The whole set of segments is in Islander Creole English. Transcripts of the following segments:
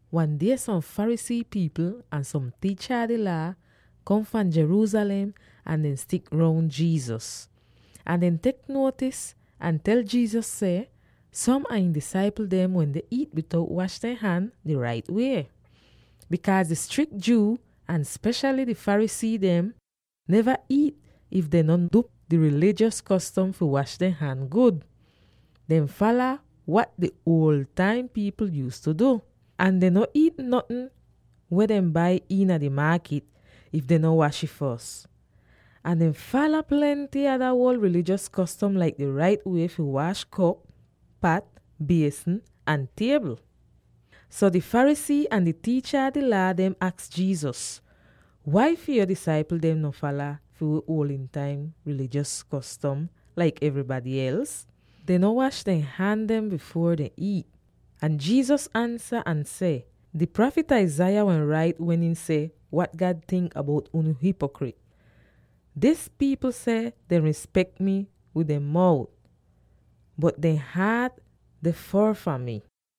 Wan die som Pharisee pipl ahn som tiicha a di Laa kom fahn Jerusalem ahn dehn stik roun Jesus. Ahn dehn tek nuotis ahn tel Jesus seh som a ihn disaipl dem wende iit bitout wash dehn han di rait wie. Bikaaz di strik Jew, ahn speshaly di Pharisee dem, neva iit, if dehn no du di rilijos kostom fi wash dehn han gud. Dehn fala wat di uoldn taim pipl yuuztu du. Ahn dehn no iit notn weh dehn bai iina di maakit, if dehn no wash ih fos. Ahn dehn fala plenty ada uol rilijos kostom laik di rait wie fi wash kop, pat, biesn, ahn tiebl. So di Pharisee ahn di tiicha a di Laa dehn aks Jesus, “Wai fi yo disaipl dem no fala fi wi uol taim rilijos kostom laik evrybady els? Dehn no wash dehn han dem bifuor dehn iit.” Ahn Jesus ansa ahn seh, “Di prafit Isaiah wehn rait, wen ihn seh wat God tink bout unu hipokrit: ‘Dis pipl seh dehn rispek mi wid dehn mout, bot dehn haat deh foor fahn mi.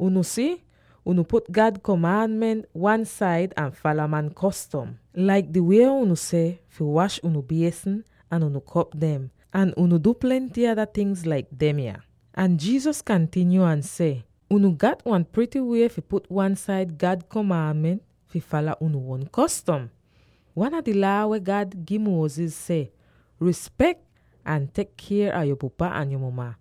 “Unu si, unu put God komaanment wan-said ahn fala man kostom, [laik di wie unu seh fi wash unu biesn, ahn unu kop dem. Ahn unu du plenty ada ting laik demya.]” Ahn Jesus kantinyo ahn seh, “Unu gat wan prity wie fi put wan-said God komaanment fi fala unu uon kostom. Wan a di Laa weh God gi Moses seh, ‘Rispek ahn tek kier a yo pupa ahn yo muma,’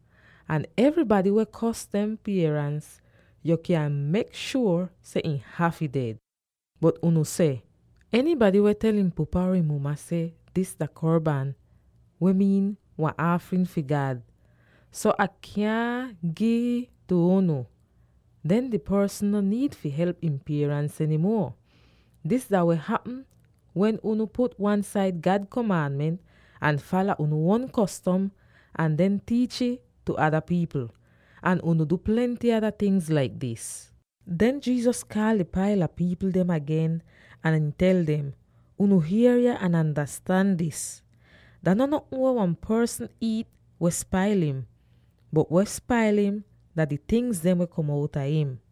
ahn, ‘Enybady weh kors dehn pierans, yo kyan mek shuor seh ihn hafy ded.’ Bot unu seh, ‘Enybady weh tel ihn pupa or ihn muma seh, “Dis dah Korban —weh miin wan aafrin fi God— so Ah kyaahn gi'ih tu unu,” den dis porsn no niid fi help ihn pierans eny muo.’ Dis dah weh hapm wen unu put God komaanment wan-said, ahn fala unu uon kostom ahn den tiich'ih tu ada pipl. Ahn unu du plenty ada ting laik dis.” Den Jesus kaal di paila pipl dem agen, ahn ihn tel dem, “Unu hier yah ahn andastan dis: Dah no notn weh wan porsn iit weh spail im; bot weh spail im dah di tingz dem weh kom outa im.”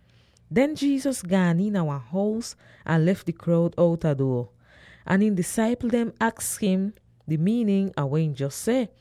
Den Jesus gaan iina wan hous ahn lef di kroud outa duo. Ahn ihn disaipl dehn aks im di miinin ah weh ihn jos seh.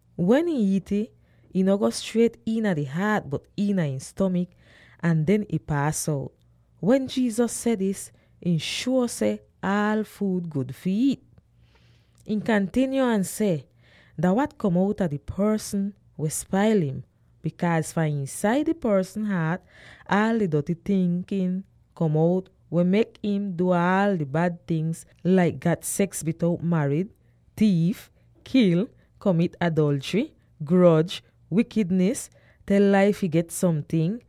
Wen ihn iit'ih, ih no go striet iina di haat, bot iina ihn stomik ahn den ih paas out.” Wen Jesus seh dis, ihn shuo seh aal fuud gud fi iit. Ihn kantinyo ahn seh, “Dah wat kom outa di porsn weh spail im, bikaaz fahn iinsaida di porsn haat aal di doty tinkin kom out weh mek im du aal di bad tingz, laik gat seks bitout marid, tiif, kil, komit adolchry, groj, wikidnis, tel lai fi get somting,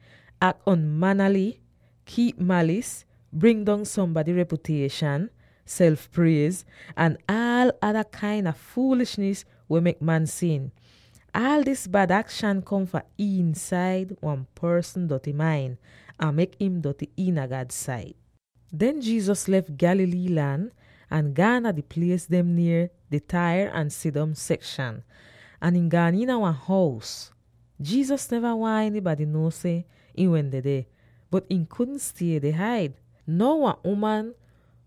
ak on'manaly, kiip malis, bring dong sombady repyutieshan, self priez, ahn aal ada kain a fuulishnis weh mek man sin. Aal dis bad akshan kom fahn iinsaid wan porsn doty main, ahn mek im doty iina God sait.” Den Jesus lef Galilee lan ahn gaan dah di plies dem nier di Tyre ahn Sidon sekshan, ahn ihn gaan iina wan hous. Jesus neva waahn enybady nuo seh ihn wehn dedeh, bot ihn kudn stie deh haid. Now, wan uman,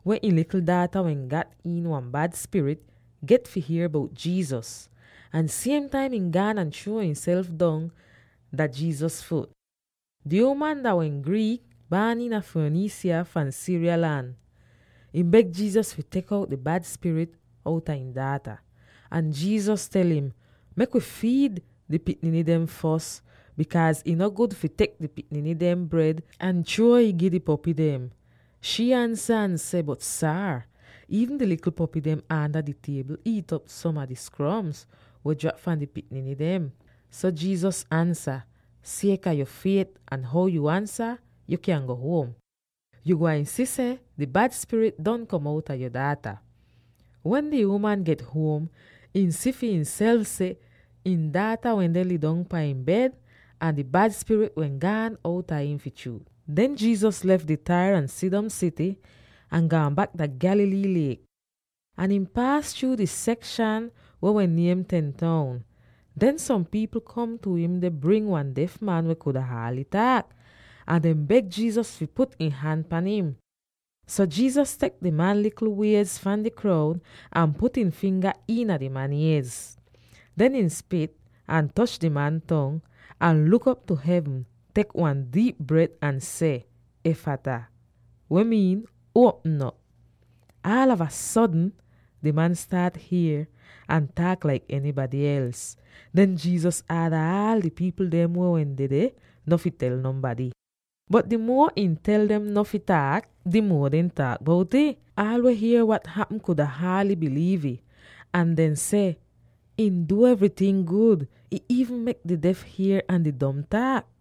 weh ihn likl daata wehn gat iin wan bad spirit, get fi hier bout Jesus, ahn siem taim ihn gaan ahn chruo ihnself dong dah Jesus fut. Di uman dah wehn Greek, baan iina Phoenicia fahn Syria lan. Ihn beg Jesus fi tek out di bad spirit outa ihn daata. Ahn Jesus tel im, “Mek wi fiid di pikniny dem fos, bikaaz ih no gud fi tek di pikniny dehn bred ahn chruo'ih, gi di popy dem.” Shii ansa ahn seh, “Bot Saar, iivn di likl popy dem aanda di tiebl iit'op som a di skroms weh drap fahn di pikniny dem.” So Jesus ansa, “Sieka yo fiet ahn how yu ansa, yu kyan go huom. Yu gwain si seh di bad spirit don kom outa yo daata.” Wen di uman get huom, ihn si fi ihnself seh ihn daata wende lidong pan ihn bed ahn di bad spirit wehn gaan outa im fi chruut! Den Jesus lef di Tyre ahn Sidon sity ahn gaan bak dah Galilee liek. Ahn ihn paas chruu di sekshan weh wehn niem “Ten Town.” Den som pipl kom tu im deh bring wan def man weh kuda haaly taak. Ahn dehn beg Jesus fi put ihn han pan im. So Jesus tek di man likl wiez fahn di kroud ahn put ihn finga iina di man iez. Den ihn spit, ahn toch di man tong, ahn luk op tu hevn, tek wan diip bret, ahn seh, “Ephphatha,” weh miin, “Uopm op!” Aalava sodn di man staat hier ahn taak laik enybady els! Den Jesus aada aal di pipl dem weh wehn dedeh no fi tel nonbady. Bot di muo ihn tel dem no fi taak, di muo dehn taak bout'ih. Aal weh hier wat hapm kuda haaly biliiv'ih. Ahn dehn seh, “Ihn du evryting gud. Ihn iivn mek di def hier ahn di dom taak!”